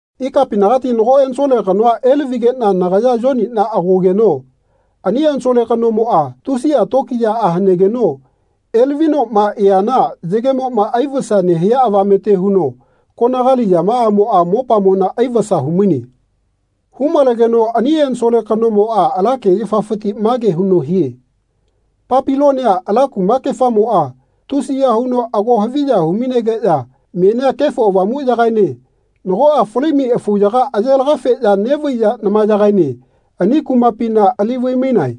Ikapinagati nago ensole kanoa elavigeꞌna nagaya Yoniꞌna agogeno ani ensole kanomoꞌa tusiꞌa tokiyaꞌa hanegeno elavinoꞌma eana yagemoꞌma aivasa nehia avamete huno konagali yamaꞌamoꞌa mopamona aivasa humaine. Hu-malegeno ani ensole kanomoꞌa ala kegefafiti mage huno hie “Papilonia ala kumakefamoꞌa tusiya huno ago haviya hu-mainegeꞌya menia Kefo Avamuꞌyagaene nagoꞌa fali-mai afuyaga aye laga-feꞌya neꞌvaiya namayagaene ani kumapina ali vai-mainae.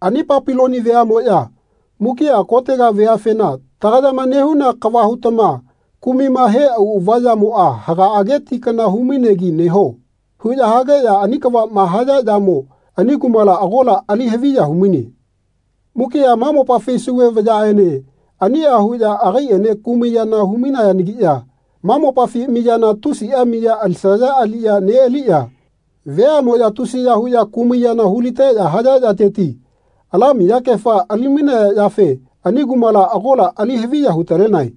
Ani Papiloni veaꞌmoꞌya mukiꞌa kotega veafena ‘Tagayama nehuna kava hutama kumaima he auꞌava yamoꞌa hagaꞌage ti kana hu-mainegi neho.’ huꞌya hageꞌya ani kavaꞌma haya yamo ani kumala agola ali haviya humaine. Mukiꞌa ma mopafi Sauve vayaꞌene aniꞌa huꞌya agaiꞌene kumai yana hu-mainayagiꞌya ma mopafi miyana tusiꞌa miya alisaya aliꞌya neꞌaliya veaꞌmoꞌya tusiya huꞌya kumai yana hu-liteꞌya haya yateti ala miyakefa ali-mainaya yafe ani kumala agola ali haviya hu-talenae.”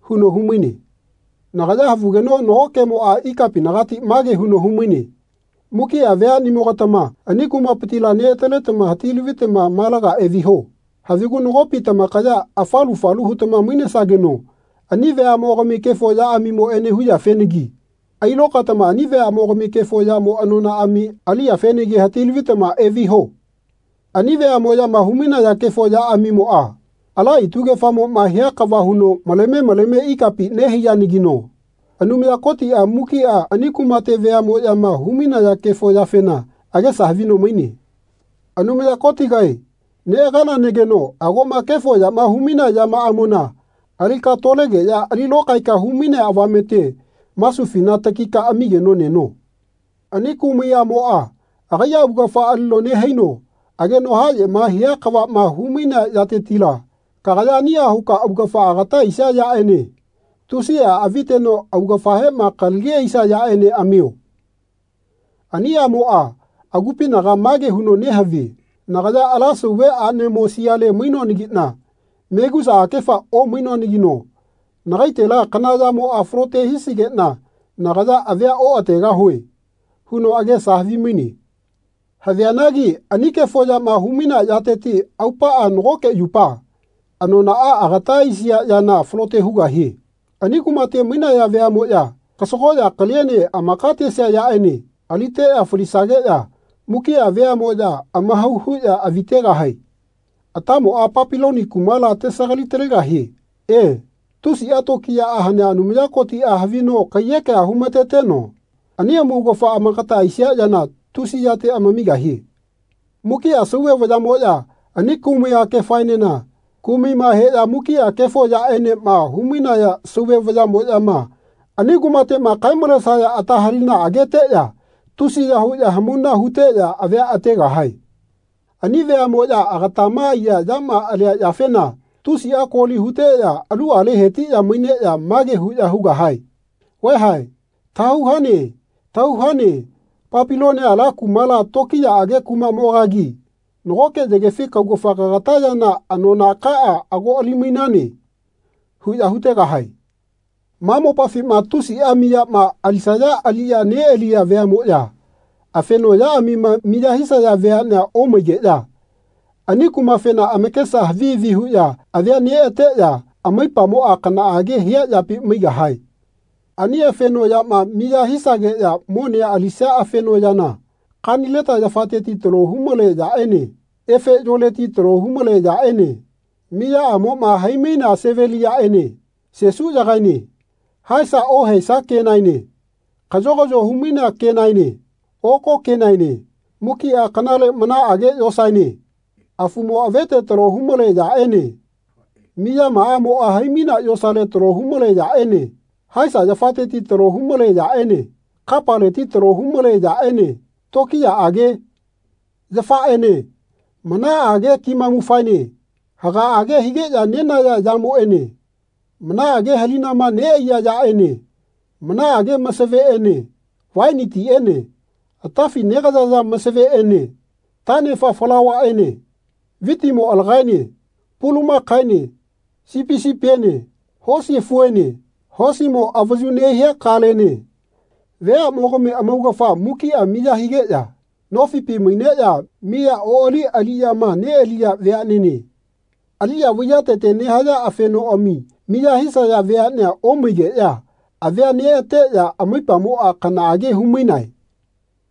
huno humaine. Nagaya havugeno nago kemoꞌa ikapinagati mage huno humaine “Mukiꞌa veaꞌnimogatama ani kumapitila neꞌataletama hati-lavitama malaga eviho. Havigu nagopi tamakaya afalu falu hutama mainesageno ani veaꞌmogami kefo yaꞌamimoꞌene huyafenagi ailokaetama ani veaꞌmogami kefo yamo anonaꞌami aliyafenagi hati-lavitama eviho. Ani veaꞌmoꞌyama humainaya kefo yaꞌamimoꞌa ala itugefamoꞌma hia kava huno maleme maleme ikapi nehaiyanagino Anumaya Kotiꞌa mukiꞌa ani kumate veaꞌmoꞌyama hu-mainaya kefo yafena agesa havino maine. Anumaya Kotigae neꞌaganageno agoꞌma kefo yama humainea yamaꞌamona alika tolegeꞌya ali lokaeka hu-mainea avamete masufina takika amigeno neno. Ani kumai aꞌmoꞌa agaiꞌa augafa alino nehaino ageno haꞌyema hia kavaꞌma hu-mainea yatetila kagaya aniꞌa huka augafa agata aisia yaꞌene tusiꞌa aviteno augafahema kalagi aisia yaꞌene amio. Ani aꞌmoꞌa agupinaga mage huno nehavie ‘Nagaya ala Sauve aꞌnemo siale mainoanagiꞌna megusa akefa omainoanagino nagaitela kana yamoꞌa falote hisigeꞌna nagaya avia oꞌategahue.’ huno agesa havimaine. Havianagi ani kefo yama humainea yateti aupaꞌa nagoke yupa anonaꞌa agata aisia yana falote hugahie. Ani kumate mainaya veaꞌmoꞌya kasagoꞌya kaliene amaka tesia yaꞌene aliteꞌya falisageꞌya mukiꞌa veaꞌmoꞌya amahau huꞌya avi tegahae. Atamoꞌa Papiloni kumala tesagali-talegahie. E, tusiꞌa tokiyaꞌa hanea Anumaya Kotiꞌa havino kaiyekea humateteno anima amaugafa amakata aisia yana tusi yate amamigahie. Mukiꞌa Sauve vayaꞌmoꞌya ani kumai akefaenena kumaima heꞌya mukiꞌa kefo yaꞌenema humainaya Sauve vayaꞌmoꞌyama ani kumateꞌma kae-malesageno ata halinamoꞌma ageteꞌya tusiya huꞌya hamauna huteꞌya avia ategahae. Ani veaꞌmoꞌya agatama aiya yama alia yafena tusiꞌa koli huteꞌya aluꞌale hetiꞌya maineꞌya mage huꞌya hugahae ‘Vaeha tahau hane tahau hane Papilonia ala kumala tokiyaꞌage kumaꞌmogagi nagoke yagefi kaugafa kagata yana anonakaꞌa ago ali-mainane.’ huꞌya hutegahae. Ma mopafima tusiꞌa miyama alisaya aliꞌya neꞌaliya veaꞌmoꞌya afeno yaꞌamima miya hisaya veaꞌnea omaigeꞌya ani kumafena amakesa havi havi huꞌya avia neꞌateꞌya amaipamoꞌa kanaꞌage hia yapi maigahae. Ani afeno yama miya hisageꞌya monea alisia afeno yana kanileta yafateti talo humale yaꞌene efe yoleti talo humale yaꞌene miyamaꞌamoꞌa hai-mainea seveliyaꞌene sesuyagaene haesa ohaesa kenaene kaꞌyogaꞌyo humainea kenaene oko kenaene mukiꞌa kanale manaꞌage yosaene afumo avete talo humale yaꞌene miyamaꞌamoꞌa hai-mainea yosale talo humale yaꞌene haesa yafateti talo humale yaꞌene kapaleti talo humale yaꞌene tokiyaꞌage yafaꞌene manaꞌage kimamufaene hagaꞌage higeꞌya nenaya yamoꞌene manaꞌage halinama nehia yaꞌene manaꞌage masaveꞌene vaini tiꞌene atafi negayaya masaveꞌene taꞌnefa falauvaꞌene vitimo alagaene pulamakaene sipi sipiene hosi afuene hosimo avayuma nehia kalene veaꞌmogami amaugafa mukiꞌa miya higeꞌya nofipi maineꞌya miya oꞌali aliꞌyama neꞌaliya veaꞌnene, aliꞌya vaiyatete nehaya afenoꞌami miya hisaya veaꞌnea omaigeꞌya avia neꞌateꞌya amaipamoꞌa kanaꞌage humainae.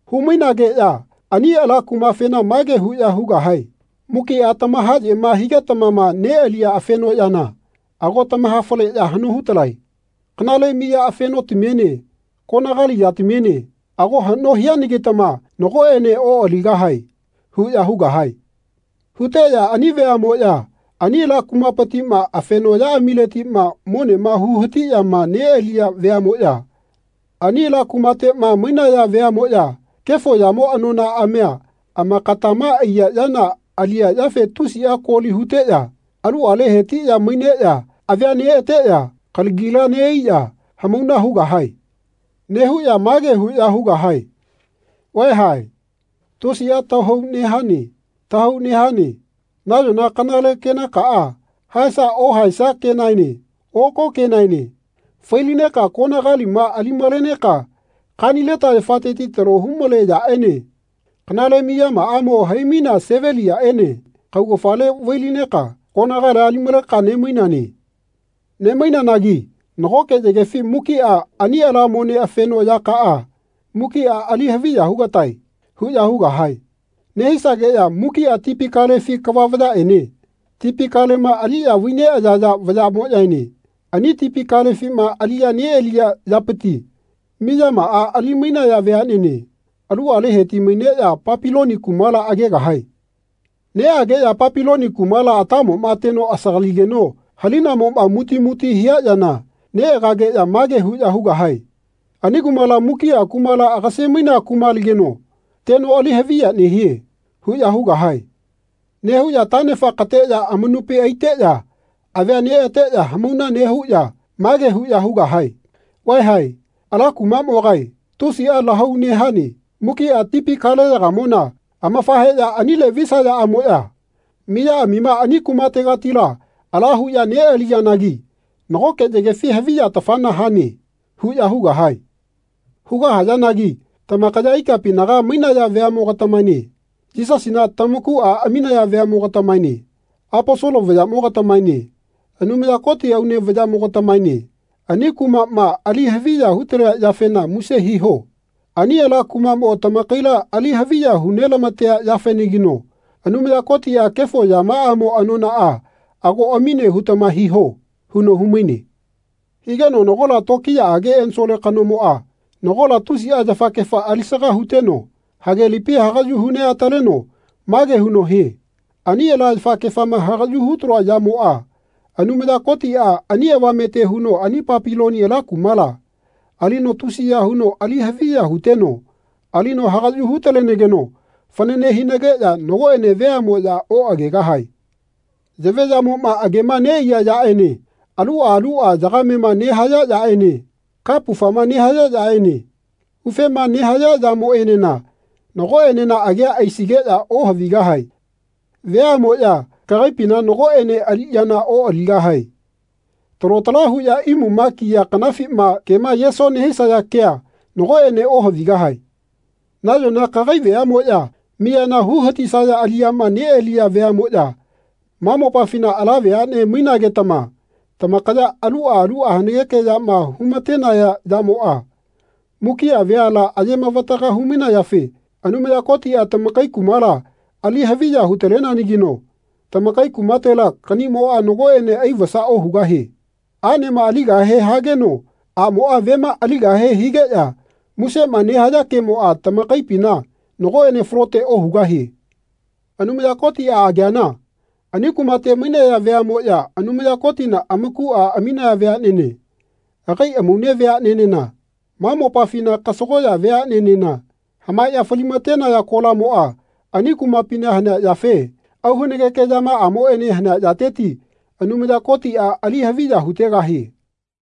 Humainageꞌya ani ala kumafena mage huꞌya hugahae ‘Mukiꞌa tamahaꞌyema higetamama neꞌaliya afenoꞌyana ago tamahafaleꞌya haꞌno hutalae. Kanale miya afenotamiene konagali yatamiene ago haꞌno hianagitama nagoꞌene oꞌaligahae.’ huꞌya hugahae. Huteꞌya ani veaꞌmoꞌya ani ala kumapitiꞌma afenoꞌyaꞌamileti monema hu-hatiꞌyama neꞌaliya veaꞌmoꞌya ani ala kumateꞌma mainaya veaꞌmoꞌya kefo yamo anonaꞌamia amakatama aiya yana aliya yafe tusiꞌa koli huteꞌya aluꞌale hetiꞌya maineꞌya avia neꞌateꞌya kalagila neꞌaiꞌya hamauna hugahae. Nehuꞌya mage huꞌya hugahae ‘Vaeha tusiꞌa tahau nehane tahau nehane. Nayona kanale kenakaꞌa haesa ohaesa kenaene oko kenaene fai-lineka konagalima ali-maleneka kanileta yafateti talo humale yaꞌene kanale miyamaꞌamo hai-mainea seveliyaꞌene kaugafale vai-lineka konagalia ali-maleka nemainane. Nemainanagi nagoke yagefi mukiꞌa ani ala mone afeno yakaꞌa mukiꞌa ali haviya hugatae.’ huꞌya hugahae. Nehisageꞌya ‘Mukiꞌa tipi kalefi kava vayaꞌene tipi kalema aliꞌya vai neꞌayaya vayaꞌmoꞌyaene ani tipi kalefima aliꞌya neꞌaliya yapiti miyamaꞌa ali-mainaya veaꞌnene aluꞌale heti-maineꞌya Papiloni kumala agegahae. Neꞌageꞌya Papiloni kumala atamoꞌma teno asagaligeno halinamoꞌma muti muti hia yana neꞌageꞌya mage huꞌya hugahae ‘Ani kumala mukiꞌa kumala agase-mainea kumalageno teno ali haviya nehie.’ huꞌya hugahae. Nehuꞌya taꞌnefa kateꞌya amanupi aiteꞌya avia neꞌateꞌya hamauna nehuꞌya mage huꞌya hugahae ‘Vaeha ala kumaꞌmogae tusiꞌa lahau nehane.’ Mukiꞌa tipi kaleyagamona amafaheꞌya anile visayaꞌamoꞌya miyaꞌamima ani kumategatila ala huꞌya neꞌaliyanagi nagoke yagefi haviya-tafana hane.’ huꞌya hugahae. Hugahayanagi tamakaya ikapinaga mainaya veaꞌmo-gatamaene Yisasina tamakuꞌa aminaya veaꞌmo-gatamaene Aposolo vayaꞌmo-gatamaene Anumaya Koti aune veaꞌmogatamaene ani kumaꞌma ali haviya hutalea yafena muse hiho. Ani ala kumaꞌmo tamakaila ali haviya hu nelamatea yafenagino Anumaya Kotiꞌa kefo yamaꞌamo anonaꞌa ago amine hutama hiho.” huno humaine. Higeno nagola tokiyaꞌage ensole kanomoꞌa nagola tusiꞌa yafakefa alisaga huteno hagelipi hagaꞌyu hu neꞌataleno mage huno hie ani ala yafakefama hagaꞌyu hutaloa yamoꞌa Anumaya Kotiꞌa ani avamete huno ani Papilonia ala kumala, alino tusiya huno ali haviya huteno alino hagaꞌyu hu-talenageno fanane hinageꞌya nagoꞌene veaꞌmoꞌya oꞌagegahae. Yaveꞌyamoꞌma agema neꞌaiya yaꞌene aluꞌa aluꞌa yagamema nehaya yaꞌene kapufama nehaya yaꞌene ufema nehaya yamoꞌenena nagoꞌenena agea aisigeꞌya ohavigahae. Veaꞌmoꞌya kagaipina nagoꞌene aliꞌyana oꞌaligahae. Talo tala huꞌya imuma kiya kanafima kema yeso nehisaya kea nagoꞌene ohavigahae. Nayona kagai veaꞌmoꞌya miyana hu hatisaya aliꞌyama neꞌaliya veaꞌmoꞌya ma mopafina ala veaꞌne mainagetama tamakaya aluꞌa aluꞌa hanageke yama humatenaya yamoꞌa mukiꞌa veala ayemavataga hu-mainayafe Anumaya Kotiꞌa tamakai kumala ali haviya hu-taleneanagino tamakai kumatela kaꞌniꞌmoꞌa nagoꞌene aivasa ohugahie. Aꞌnema aligahe hageno aꞌmoꞌa vema aligahe higeꞌya musema nehaya kemoꞌa tamakaipina nagoꞌene falote ohugahie. Anumaya Kotiꞌa ageana ani kumate mainaya veaꞌmoꞌya Anumaya Kotina amakuꞌa aminaya veaꞌnene agai amaune veaꞌnenena ma mopafina kasagoꞌya veaꞌnenena hamaeꞌya falimatenaya kolamoꞌa ani kumapina hanea yafe auhanageke yamaꞌamoꞌene hanea yateti Anumaya Kotiꞌa ali haviya hutegahie.